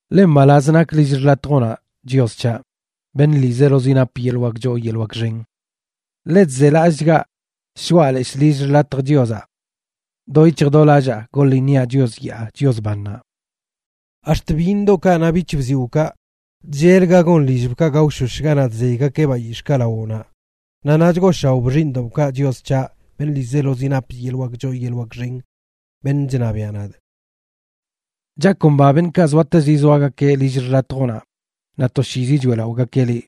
Ḻe mbalaz nak lill xḻatjoꞌnaꞌ, Chios c̱haꞌ, beṉꞌ ḻiizelozi nap yeḻꞌ wak choo yeḻꞌ wak xen. ¡Ḻe chzelallꞌchgaꞌ shoꞌa leshꞌ lill xḻatj Chiozaꞌ! ¡Do yic̱hj do lallaa goḻ iṉiaꞌ Chios yaa Chios bannaꞌ! Ax̱t byiṉ yoodoꞌkaꞌ naꞌ bic̱hbziwꞌkaꞌ chllel ga gon lillbkaꞌ gaoshosh ganaꞌ chzeygakeꞌ bayix̱ꞌkaꞌ lawoꞌnaꞌ, naꞌ naꞌ chgooshaoꞌ xiiṉdoꞌbkaꞌ, Chios c̱haꞌ, beṉꞌ ḻiizelozi nap yeḻꞌ wak choo yeḻꞌ wak xen, beṉꞌ chṉabiaꞌ nadꞌ. Chakomba beṉꞌkaꞌ zoatezi zoagakeꞌ lill xḻatjoꞌnaꞌ, naꞌ toshiizi choeꞌlaꞌogakeꞌ liꞌ.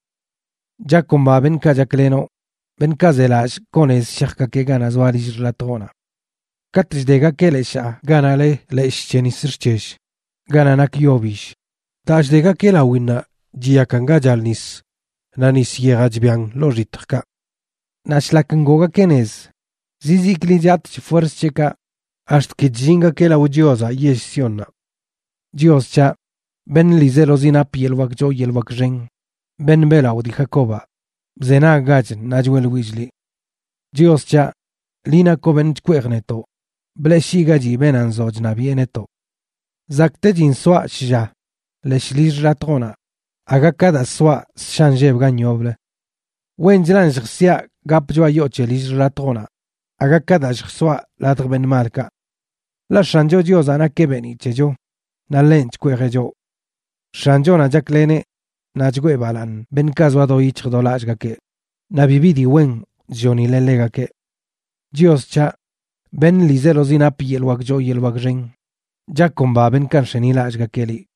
Chakomba beṉꞌkaꞌ chaklenoꞌ, beṉꞌkaꞌ zelallꞌ koo nez shajgakeꞌ ganaꞌ zoa lill xḻatjoꞌnaꞌ. Katꞌ chdegakeꞌ leshaa ganaꞌ le Leshꞌ c̱he nis xc̱hell, ganaꞌ nak yo bill, daa chdegakeꞌ lawinnaꞌ chiyakan ga chal nis, naꞌ nis yejaꞌ chbian ḻoo xitjkaꞌ. Naꞌ shlak ngoogakeꞌ nez, zizikli chatꞌch fuerz c̱heꞌkaꞌ ax̱t ki chllingakeꞌ lao Chiozaꞌ yell Siónnaꞌ. Chios c̱haꞌ, beṉꞌ ḻiizelozi nap yeḻꞌ wak choo yeḻꞌ wak xen, beṉꞌ beꞌlaꞌo dii Jacobaꞌ, bzenaggach ṉaa choeꞌḻwillꞌ liꞌ. Chios c̱haꞌ, liꞌ nakoꞌ beṉꞌ chkweej netoꞌ, bleꞌshiꞌgachi beenaꞌ nzoꞌ chṉabiꞌe netoꞌ. Zakꞌtechin soaꞌ shlla leshꞌ lill xḻatjoꞌnaꞌ aga ka daa soaꞌ ssha inlleb gan yoblə. Wenchlan lljsiaꞌ gapꞌ choꞌa yoo c̱he lill xḻatjoꞌnaꞌ aga ka daa lljsoaꞌ ladj beṉꞌ malkaꞌ. Ḻaꞌ X̱ancho Chiozaꞌ nakeꞌ beeniꞌ c̱hecho, naꞌ ḻenꞌ chkweejeꞌ choꞌ. X̱anchonaꞌ chakleneꞌ naꞌ chgwee balaaṉ beṉꞌkaꞌ zoa do yic̱hj do lallꞌgakeꞌ, naꞌ bibi dii wen chllonileꞌ ḻegakeꞌ. Chios c̱haꞌ, beṉꞌ ḻiizelozi nap yeḻꞌ wak choo yeḻꞌ wak xen, chakomba beṉꞌkaꞌ nx̱enilallꞌgakeꞌ liꞌ.